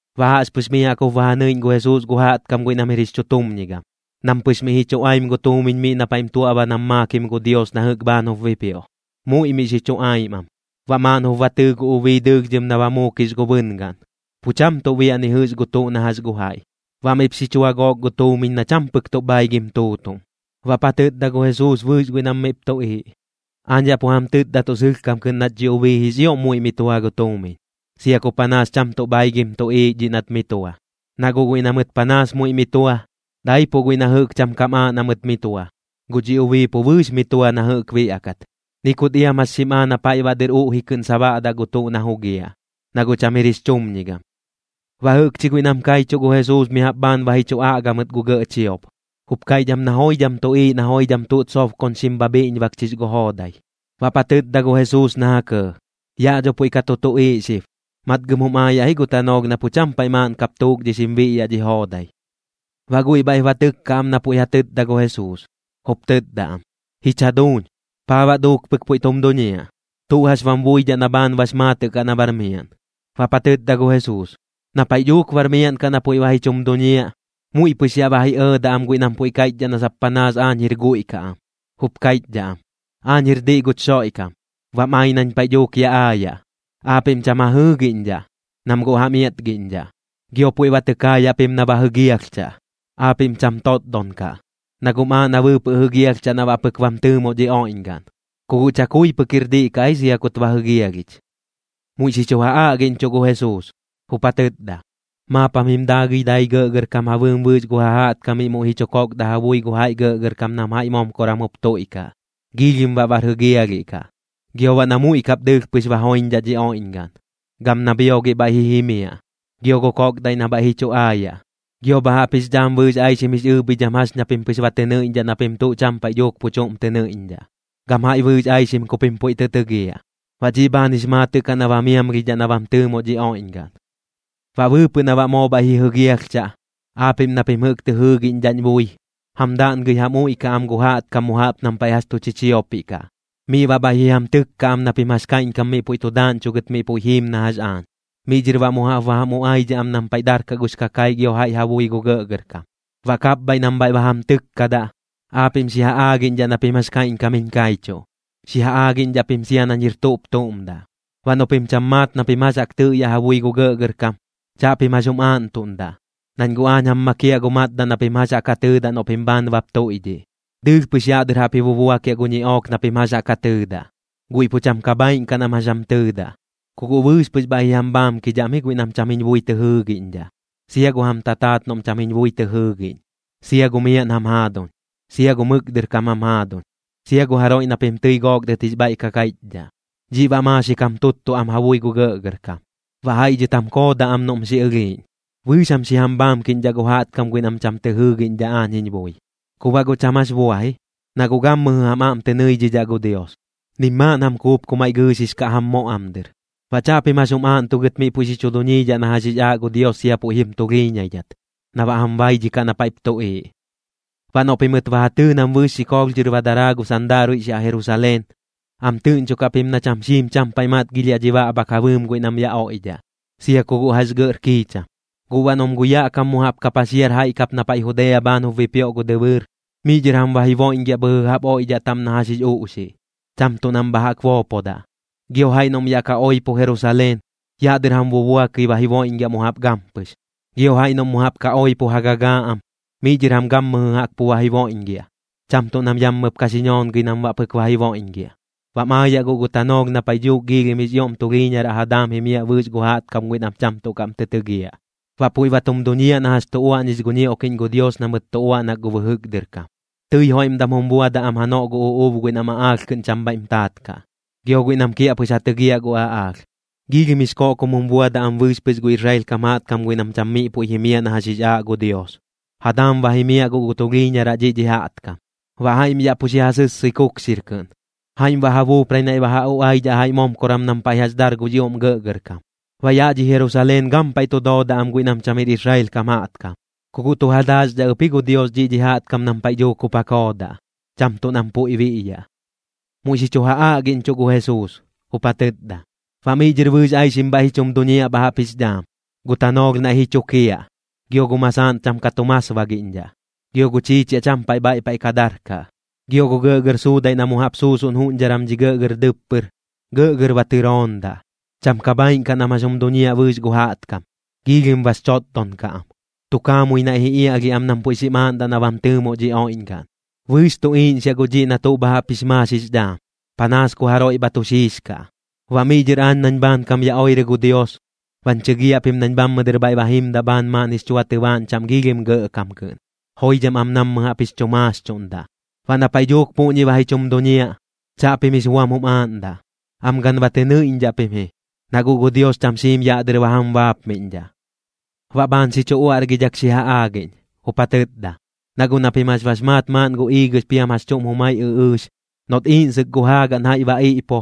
Baꞌ jaꞌxpɨx miꞌ jaꞌk jup ba ja nɨiꞌñ gu Jesuus gu jaꞌtkam guiꞌ nam jir jix chutumñigam, nam pɨx miꞌ ji chuꞌaim gu tuumiñ miꞌ na paiꞌm tuaꞌba nam maakim gu Dios na jɨꞌk bhaan jup bipioꞌ. Muiꞌ miꞌ xi chuꞌaim am. Baꞌ maaꞌn jup ba tɨɨ gu ubii dɨɨlhdhɨm na ba muukix gu bɨngaꞌn, pu cham tuꞌ biaꞌ ni jɨꞌx gu tuꞌ na jax gu jaiꞌ. Baꞌ miꞌp xi chua gook gu tuumiñ na cham pɨk tuꞌ bhaigim tuutuꞌm. Baꞌp ja tɨtda gu Jesuus bɨɨx guiꞌ nam miꞌp tuꞌiiꞌ: ―Aañ yaꞌ pu jam tɨtda tuꞌ sɨlhkam kɨꞌn nat dhi ubii jix ioꞌm muiꞌ mi tua gu tuumiñ, sia ku panaas cham tuꞌ bhaigim tuꞌiiꞌ dhiꞌ nat mi tua. Na guꞌ guiꞌ na mɨt panaas muiꞌ mi tua, daipuꞌ guiꞌ na jɨꞌk cham kam aaꞌ na mɨt mi tua. Guꞌ dhi ubii pu bɨɨx mi tua na jɨꞌk biaꞌkat, ni kut iam jax xim aa na paiꞌ baꞌ dɨr uꞌji kɨꞌn sabaꞌdaꞌ gu tuꞌ na jugiaꞌ, na guꞌ cham jir jix chumñigam. Baꞌ jɨꞌkchi guiꞌ nam kaichuꞌ gu Jesuus mi jaꞌp bhaan ba ji chu aꞌga mɨt gu gɇꞌ chiop, jup kaiꞌch am na joidham tuꞌiiꞌ na joidham tuꞌt sobkoñxim bha bhiꞌñbakchix gu joodai. Baꞌp ja tɨtda gu Jesuus na ja kɇɇ: ―Yaꞌ dho puiꞌ ka tu tuꞌiiꞌ xib. Matgɨm jum aayaꞌ ji gu tanoolh na pu cham paiꞌ maaꞌn kap tuukdhixim biꞌyaꞌ dhi joodai. Baꞌ guiꞌ bhaiꞌp ba tɨkka am na puiꞌ ja tɨtda gu Jesuus, jup tɨtda am: ―Jich jaduuñ, ¿paa baꞌ duuk pɨk puiꞌ tum duñiaꞌ? ¿Tuꞌ jax bam buidhaꞌ na bhaan bax maatɨꞌ kaꞌ na bar miaꞌn? Baꞌp ja tɨtda gu Jesuus: ―Na paiꞌ dhuuk bar miaꞌn kaꞌ na puiꞌ ba ji chum duñiaꞌ, muiꞌ pɨx yaꞌ ba ji ɇɇdaꞌ am guiꞌ nam puiꞌ kaiꞌchdhaꞌ na sap panaas aañ jir guiꞌ kaꞌ am. Jup kaiꞌchdhaꞌ am: “Aañ jir diꞌ guch Xoiꞌkam. Bam ai nañ paiꞌ dhuuk ya aayaꞌ.” Aapiꞌm cham ja jɨɨgiꞌñdhaꞌ, nam guꞌ jam iatgiꞌñdhaꞌ. Gio puiꞌ ba tɨ kaayaꞌ pim na ba jɨgialhchaꞌ. Aapiꞌm cham totdon kaꞌ, na guꞌm aaꞌ na bɨɨpɨꞌ jɨgialhchaꞌ na baꞌ pɨk bam tɨɨmoꞌ dhi oiꞌñgaꞌn. Ku guꞌ chakui pɨk jir diꞌ kaꞌ ji sia kut ba jɨgialhich. Muiꞌ xi chu ja aꞌgiꞌñchuꞌ gu Jesuus, jup ja tɨtda: ―Maap jam jim daagɨi dai gɇꞌgɇrkam ja bɨɨm bɨɨx gu ja jaꞌtkamiꞌ muiꞌ ji chu kokdaꞌ ja bui gu jaiꞌ gɇꞌgɇrkam nam jaiꞌ momkoram jup tuiꞌkaꞌ. Giilhim baꞌ bar jɨgialhiꞌ kaꞌ. Gio baꞌ na muiꞌ kap dɨɨlh pɨx ba joiñdhaꞌ dhi oiꞌñgaꞌn. Gam na bhiogiꞌ bhaiꞌ ji jimiaꞌ. Gio gu koꞌkdaiꞌ na bhaiꞌ ji chu aayaꞌ. Gio bha jaꞌp jix dhaam bɨɨx aixim jix ɨɨbhidham jax ña pim pɨx ba tɨ nɨiꞌñdhaꞌ na pim tuꞌ cham paiꞌ dhuuk pu chuꞌm tɨ nɨiꞌñdhaꞌ. Gam jaiꞌ bɨɨx aixim ku pim puiꞌ tɨ tɨgiaꞌ. Baꞌ dhiꞌ bhaan jix maatɨꞌ kaꞌ na ba miamlhidhaꞌ na bam tɨɨmoꞌ dhi oiꞌñgaꞌn. ’Baꞌ bɨɨpɨꞌ na baꞌ moo bhaiꞌ ji jɨgialhchaꞌ, aapiꞌm na pim jɨꞌk tɨ jɨɨgiꞌñdhaꞌñ bui, jam daꞌngɨi jam uiꞌkaꞌ am gu jaꞌtkam mu jaꞌp nam paiꞌ jax tu chichiopiꞌ kaꞌ, miꞌ baꞌ bhaiꞌ ji jam tɨkkaꞌ am na pim jax kaiꞌñkam miꞌ puiꞌ tu daaꞌñchugɨt miꞌ puiꞌ jiim na jax aañ. Miꞌ dhɨr baꞌ mu jaꞌp ba jam uꞌaidhaꞌ am nam paiꞌ jax darkaꞌ gux kakaiꞌ gio jaiꞌ ja bui gu gɇꞌgɇrkam. Baꞌ kapbhaiꞌ nam bhaiꞌ ba jam tɨkkadaꞌ, aapiꞌm xi ja aagiꞌñdhaꞌ na pim jax kaiꞌñkam jiñ kaichuꞌ, xi ja aagiꞌñdhaꞌ pim sia nañ jir tuꞌp tuꞌm daꞌ. Baꞌ noꞌ pim cham maat na pim jax jaꞌk tɨꞌyaꞌ ja bui gu gɇꞌgɇrkam, chaꞌpim jax jum aaꞌntuꞌndaꞌ, nañ guꞌ aañ jam makiaꞌ gu matdaꞌ na pim jax jaꞌk ja tɨɨdaꞌ noꞌ pim bhaan bap tuiꞌdhiꞌ. Dɨɨlh pɨx yaꞌ dɨr jaꞌp ji bubuakiaꞌ gu ñiꞌook na pim jax jaꞌk ja tɨɨdaꞌ, guiꞌ pu cham ka bhaaiꞌn kaꞌ nam jax jam tɨɨdaꞌ. Ku guꞌ bɨɨx pɨx bhaiꞌ ji jam bhaamkidhaꞌm ji guiꞌ nam cham jiñ bui tɨ jɨɨgiꞌñdhaꞌ, sia gu jam tataat noꞌm cham jiñ bui tɨ jɨɨgiꞌñ, sia gu miaꞌn jam jaaduñ, sia gu mɨk dɨr kam jam jaaduñ, sia gu jaroiꞌ na pim tɨi gook dɨt jix bhaiꞌ ka kaiꞌchdhaꞌ. Dhiꞌ baꞌ maaxik jam tuttuꞌ am ja bui gu gɇꞌgɇrkam, baꞌ jaiꞌ dhɨt jam koodaꞌ am noꞌm xi ɨlhiiꞌñ. Bɨɨx jam xi jam bhaamkiꞌñdhaꞌ gu jaꞌtkam guiꞌ nam cham tɨ jɨɨgiꞌñdhaꞌ aañ jiñ bui. Ku baꞌ guꞌ cham jax bua ji, na guꞌ gammɨjɨ jam aꞌm tɨ nɨidhidhaꞌ gu Dios, nim maaꞌn jam kuup ku maiꞌ gɨɨxix kaꞌ jam moꞌ am dɨr. Baꞌ chaꞌpim jax jum aaꞌntugɨt miꞌ puiꞌ xi chu duñiidhaꞌ na jax jix aaꞌ gu Dios sia puiꞌ jim tulhiiñaidhat, na baꞌ jam baidhikaꞌ na paiꞌp tuꞌiiꞌ. ’Baꞌ noꞌ pimɨt ba ja tɨɨ nam bɨɨx xikoolh dhɨr ba daraa gu sandaaruiꞌx yaꞌ Jerusaleen, am tɨꞌñchokaꞌ pim na cham xiim cham paiꞌ matgilhiaꞌ dhi baꞌbhak ja bɨɨm guiꞌ nam yaꞌ oiꞌdhaꞌ, sia ku guꞌ jax gɇꞌr kiicham. Guꞌ baꞌ noꞌm gu yaꞌ kam mu jaꞌp ka paxiar jaiꞌ kap na puiꞌ Judea bhaan jup bipioꞌ gu dɨbɨɨr, miꞌ dhɨr jam ba jiboiꞌñgiaꞌ bhɨjɨ jaꞌp oiꞌdhaꞌ taꞌm na jax jix uꞌxiꞌ, cham tuꞌ nam bha jaꞌk boopodaꞌ. Gio jaiꞌ noꞌm yaꞌ ka oipo Jerusaleen, yaꞌ dɨr jam bubuakɨi ba jiboiꞌñgiaꞌ mu jaꞌp gampɨx. Gio jaiꞌ noꞌm mu jaꞌp ka oipo ja gagaa am, miꞌ dhɨr jam gammɨjɨ jaꞌk pu ba jiboiꞌñgiaꞌ, cham tuꞌ nam yammɨp ka xi ñoongɨi nam baꞌ pɨk ba jiboiꞌñgiaꞌ. Bam aayaꞌ guꞌ gu tanoolh na paiꞌ dhuuk giilhim jix ioꞌm tulhiiñaraꞌ ja daam jimiaꞌ bɨɨx gu jaꞌtkam guiꞌ nam cham tuꞌ kaꞌm tɨ tɨgiaꞌ, baꞌ puiꞌ ba tum duñiaꞌ na jax tu uaꞌñix gu ñioꞌkiꞌñ gu Dios na mɨt tu uaꞌnak gu bɨjɨk dɨr kam. Tɨi joiꞌmdam jum buadaꞌ am janoꞌ gu uꞌuub guiꞌ nam aꞌaalh kɨꞌn cham bhaiꞌm taat kaꞌ, gio guiꞌ nam kiaꞌpɨx ja tɨgiaꞌ gu aꞌaalh. Giilhim jix koꞌkom jum buadaꞌ am bɨɨx pɨx gu Israel kam jaꞌtkam guiꞌ nam cham miꞌ puiꞌ jimiaꞌ na jax jix aaꞌ gu Dios, ja daam ba jimiaꞌ guꞌ gu tulhiiñaraꞌ dhiꞌ dhi jaꞌtkam. Baꞌ jaiꞌm yaꞌ pu xi ja sɨssɨi kukxir kɨꞌn, jaiꞌm baꞌ ja buuprai naiꞌ ba ja uꞌaidhaꞌ jaiꞌ momkoram nam paiꞌ jax dar gux ioꞌm gɇꞌgɇrkam. Baꞌ yaꞌ dhi Jerusaleen gampaiꞌ tu doodaꞌ am guiꞌ nam cham jir Israel kam jaꞌtkam, ku guꞌ tu ja daaxdhaꞌ ɨp ji gu Dios dhiꞌ dhi jaꞌtkam nam paiꞌ dhuuk jup ja koodaꞌ, cham tuꞌ nam puiꞌ biꞌyaꞌ. Muiꞌ xi chu ja aꞌgiꞌñchuꞌ gu Jesuus, jup ja tɨtda: ―Baꞌ miꞌ dhɨr bɨɨx aixim bhaiꞌ ji chum duñiaꞌ bha jaꞌp jix dhaam. Gu tanoolh naiꞌ ji chukiaꞌ, gio gu masaaꞌn cham ka tu masbagiꞌñdhaꞌ, gio gu chiichiaꞌ cham paiꞌ bhaiꞌ paiꞌ ka darkaꞌ, gio gu gɇꞌgɇr suudaiꞌ na mu jaꞌp suusuꞌn juꞌñdharam dhi gɇꞌgɇr dɨppɨr, gɇꞌgɇr ba tɨroondaꞌ. Cham ka bhaaiꞌn kaꞌ nam jax jum duñiaꞌ bɨɨx gu jaꞌtkam, giilhim bax chotdon kaꞌ am. Tu kaamui naiꞌ ji iaꞌlhiaꞌ am nam puiꞌ xim aaꞌndaꞌ na bam tɨɨmo dhi oiꞌñgaꞌn. Bɨɨx tu iiꞌñxiaꞌ guꞌ dhiꞌ na tuꞌ xib bha jaꞌp jix maax jix dhaam, panaas ku jaroiꞌ bha tu xiixkaꞌ. Baꞌ miꞌ dhɨr aañ nañ bhaankam ya oirɨ gu Dios, bañ chɨgiaꞌ pim nañ bhammɨ dɨr bhaiꞌ ba jimdaꞌ bhaan maaꞌn jix chua tɨbaaꞌñ chaꞌm giilhim gɇꞌkam kɨꞌn, joidham am nammɨ jaꞌp jix chu maaxchuꞌndaꞌ. Baꞌ na paiꞌ dhuuk puꞌñi ba ji chum duñiaꞌ, chaꞌpim jix buam jum aaꞌndaꞌ. Am gan ba tɨ nɨiꞌñdhaꞌ pim ji, na guꞌ gu Dios cham xiim yaꞌ dɨr ba jam baapmiꞌñdhaꞌ. Baꞌ bhaan xi chu uaꞌrgidhak xi ja aagiꞌñ, jup ja tɨtda: ―Na guꞌ na pim jax bax maat maaꞌn gu iigɨx piam jax chuꞌm jumai ɨꞌɨɨx, noꞌt iiꞌnsɨk gu jaagaꞌn jaiꞌ ba iꞌpo,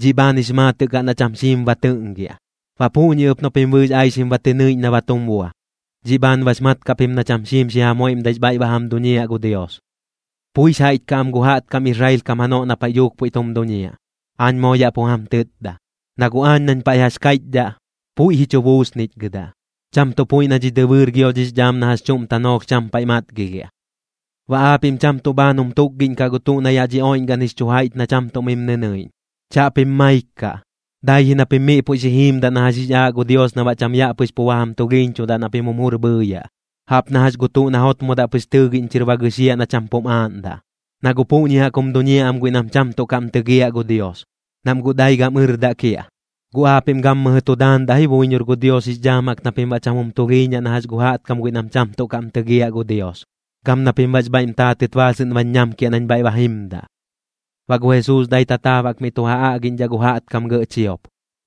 dhiꞌ bhaan jix maatɨꞌ kaꞌ na cham xiim ba tɨꞌngiaꞌ. Baꞌ puꞌñi ɨp noꞌ pim bɨɨx aixim ba tɨ nɨiꞌñ na ba tum bua, dhiꞌ bhaan bax mat kaꞌ pim na cham xiim xi jam joiꞌmdaix bhaiꞌ ba jam duñiaꞌ gu Dios. ’Puix jaiꞌch kaꞌ am gu jaꞌtkam Israel kam janoꞌ na paiꞌ dhuuk puiꞌ tum duñiaꞌ, aañ moo yaꞌ pu jam tɨtda. Na guꞌ aañ nañ paiꞌ jax kaiꞌchdhaꞌ, puiꞌ ji chu buusnichgɨdaꞌ, cham tuꞌ puiꞌ na dhi dɨbɨɨr gio dhix dhaam na jax chuꞌm tanoolh cham paiꞌ matgilhiaꞌ. ’Baꞌ aapiꞌm cham tuꞌ bhaan jum tukgiꞌñkaꞌ gu tuꞌ na yaꞌ dhi oiꞌñgaꞌn jix chu jaiꞌch na cham tuꞌ mim nɨnɨiꞌñ. Chaꞌpim maik kaꞌ, dai ji na pim miꞌ puiꞌ xi jiimdaꞌ na jax jix aaꞌ gu Dios na baꞌ cham yaꞌ pɨx pu ba jam tulhiiñchudaꞌ na pim jum jur bhɨɨyaꞌ, jaꞌp na jax gu tuꞌ na jotmodaꞌ pɨx tɨɨgiꞌñ chɨr ba gɨxiaꞌ na cham pum aaꞌndaꞌ. Na guꞌ puꞌñi jaꞌk jum duñiaꞌ am guiꞌ nam cham tuꞌ kaꞌm tɨgiaꞌ gu Dios, nam guꞌ dai gam ɨrdaꞌ kiaꞌ. Guꞌ aapiꞌm gammɨjɨ tu daandaꞌ ji buiñor gu Dios jix dhaam jaꞌk na pim baꞌ cham jum tulhiiñaꞌ na jax gu jaꞌtkam guiꞌ nam cham tuꞌ kaꞌm tɨgiaꞌ gu Dios, gam na pim baꞌx bhaiꞌm taatɨt baasɨꞌn bañ ñamkiaꞌ nañ bhaiꞌ ba jimdaꞌ. Baꞌ gu Jesuus dai tataab jaꞌk miꞌ tu ja aꞌgiꞌñdhaꞌ gu jaꞌtkam gɇꞌ chiop,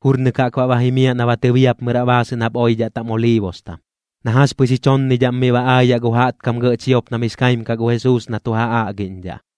jurnɨk jaꞌk baꞌ ba jimiaꞌ na ba tɨbiapmɨraꞌ baasɨꞌn jaꞌp oidhaꞌ taꞌm Oliibostam. Na jax pɨx ji chonnidhaꞌm miꞌ ba aayaꞌ gu jaꞌtkam gɇꞌ chiop nam jix kaim kaꞌ gu Jesuus na tu ja aꞌgiꞌñdhaꞌ.